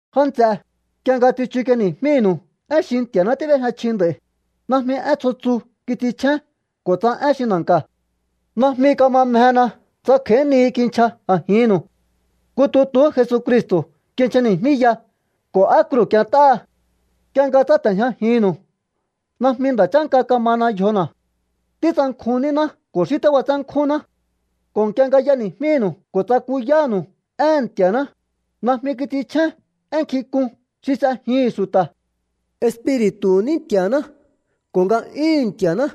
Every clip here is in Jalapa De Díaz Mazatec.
Já nts'e, nk'ie nga tsichuk'ieni̱jmínu̱u én xi Nti̱a̱ná tíb'éjña chji nd'a̱i̱, najmi én tsjo tsu kits'inchjén ko̱ tsa én xi na̱nka̱. Najmi kama mjena tsa kj'a̱í nihi kinchja a̱jinnu̱u. Nku tutuhú Jesucristo̱ kinchjani̱jmíya ko̱ á kruu̱ k'ient'áha. Nk'ie nga tsáte̱jñajinnu̱u najmi nda̱ chánka kamana yjona̱. Títsankjun níná ko̱ xí tíb'atsénkjúnná. Ko̱ nk'ie nga y'eni̱jmínu̱u ko̱ tsakuyánu̱u éhe̱n Nti̱a̱ná, najmi kits'inchjén én nkjink'un xi s'ejihi̱n xu̱ta̱. Espiri̱tu̱hu̱ ní Nti̱a̱ná ko̱ nga'yúhu̱n Nti̱a̱ná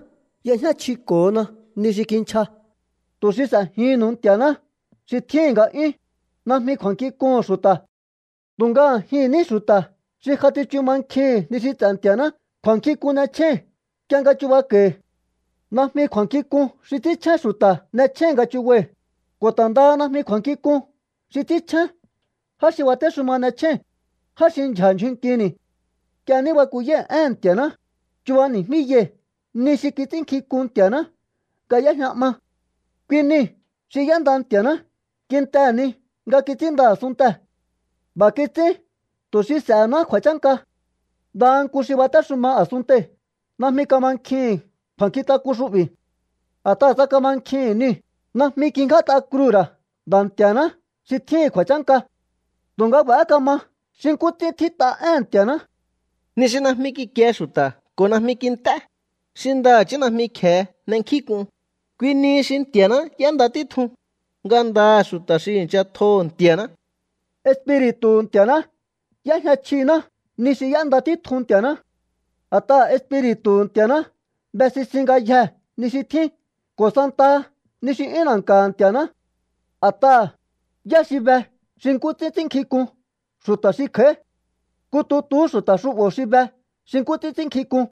y'ejñá chjiko̱hona ni xi kinchja, tu̱ xi s'e̱jihi̱nnu̱u Nti̱a̱ná xi tjíhi̱n nga'yún, najmi kju̱a̱nkjink'uhu̱n xu̱ta̱. Tu̱nga a̱jihi̱n ní xu̱ta̱ xi ja tsichu mankjihi̱n ni xi ts'e̱ Nti̱a̱ná kju̱a̱nkjink'un n'echjéi̱n nk'ie nga chubako̱i̱. Najmi kju̱a̱nkjink'un xi ts'ínchjén xu̱ta̱ n'echjéi̱n nga chubai̱, ko̱ ta̱ ndaha najmi kju̱a̱nkjink'un xi ts'ínchjén já xi batéxuma n'echjéi̱n, já xi ndyja̱ ndyjun nkini̱. Nk'ie ní bakuyái̱ éhe̱n Nti̱a̱ná, chubani̱jmíyai̱ ni xi kits'ínnkjink'un Nti̱a̱ná nga y'éjña 'ma. Kui niu̱ xi y'énda Nti̱a̱ná kintehe̱ ni nga kits'ínnda a̱sunntee̱. B'a̱ kits'ín tu̱ xi s'e̱hená kju̱a̱chánka. Ndaha nku xi batéxuma a̱sunntei̱ najmi kamankjihi̱n kju̱a̱nkjintak'un xu'bi̱. A̱t'aha̱ tsa kamankjihi̱n niu̱, najmi kingját'a kruu̱ ra̱ Nda̱ Nti̱a̱ná xi tjíhi̱n kju̱a̱chánka. Tu̱nga b'a̱há kama xi nkú ts'ín tjít'a éhe̱n Nti̱a̱ná: Ni xi najmi kikie xu̱ta̱ ko̱ najmi kint'é, xi ndaha̱chí najmi kje̱e n'enkjínk'un, kui nihi xi Nti̱a̱ná y'énda títjun, ngandaha̱ xu̱ta̱ xi i̱ncha tjoho̱ Nti̱a̱ná. Espiri̱tu̱hu̱ Nti̱a̱ná y'éjña chjiná ni xi y'énda títjun Nti̱a̱ná. A̱t'aha̱ Espiri̱tu̱hu̱ Nti̱a̱ná be sisin ngayjee̱ ni xi tjín ko̱ santaha ni xi 'yún na̱nka̱ha̱ Nti̱a̱ná. A̱t'aha̱, ¿yá xi be xi nkú ts'ín ts'ínnkjink'un xu̱ta̱ xi kj'a̱í? Nku tutuhú xu̱ta̱ xu'bo̱ xi be xi nkú ts'ín ts'ínnkjink'un.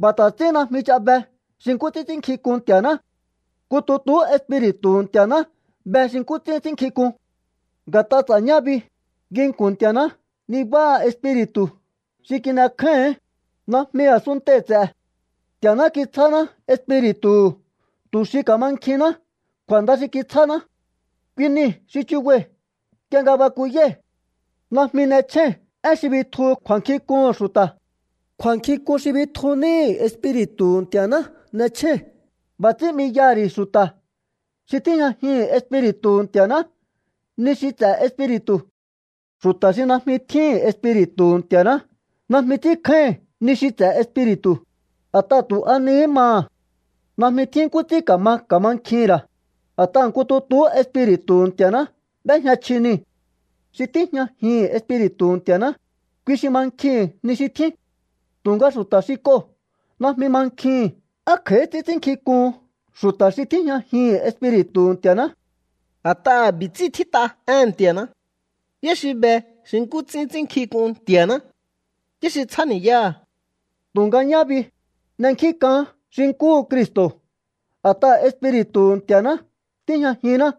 B'a̱ ta̱ ts'ín najmi ch'a be xi nkú ts'ín ts'ínnkjink'un Nti̱a̱ná. Nku tutuhú Espiri̱tu̱hu̱ Nti̱a̱ná be xi nkú ts'ín ts'ínnkjink'un. Nga̱t'a ts'a̱ñá bi, nginku̱n Nti̱a̱ná nibáha Espiri̱tu̱ xi kin'ekjáíhi̱ín, najmi a̱suntei̱ ts'e̱. Nti̱a̱ná kitsjáná Espiri̱tu̱hu̱ tu̱ xi ka̱mankjihinná kju̱a̱nda xi kitsjáná. Kui niu̱ xi chubai̱ nk'ie nga bakuyái̱. Najmi n'echjéi̱n én xi bitjuhu kju̱a̱nkjink'uhu̱n xu̱ta̱. Kju̱a̱nkjink'un xi bitju níhi̱ Espiri̱tu̱hu̱ Nti̱a̱ná n'echjéi̱n. B'a̱ ts'ín 'miyaha̱ ri̱ xu̱ta̱ xi tíjñajihi̱n Espiri̱tu̱hu̱ Nti̱a̱ná ni xi ts'e̱ Espiri̱tu̱. Xu̱ta̱ xi najmi tjíhi̱n Espiri̱tu̱hu̱ Nti̱a̱ná najmi ts'ínkjáíhi̱n ni xi ts'e̱ Espiri̱tu̱, a̱t'aha̱ tu̱ a nihí maha̱. Najmi tjín nkú ts'ín ka̱ma ka̱mankjihi̱n ra̱, a̱t'aha̱ nku tutuhú Espiri̱tu̱hu̱ Nti̱a̱ná b'éjña chji niu̱. Xi tíjñajihi̱n Espiri̱tu̱hu̱ Nti̱a̱ná, kui xi mankjihi̱n ni xi tjín. Tu̱nga xu̱ta̱ xi k'oo̱ najmi mankjihi̱n á kj'a̱í ts'ín ts'ínnkjink'uhun xu̱ta̱ xi tíjñajihi̱n Espiri̱tu̱hu̱ Nti̱a̱ná. A̱t'aha̱ b'i̱ ts'ín tjít'a éhe̱n Nti̱a̱ná: ¿Yá xi be xi nkú ts'ín ts'ínnkjink'un Nti̱a̱ná? ¿Yá xi tsjáni̱yáha̱? Tu̱nga ñá bi, n'enkjínk'aán xi nkúhu Cristo̱ a̱t'aha̱ Espiri̱tu̱hu̱ Nti̱a̱ná tíjñajinná.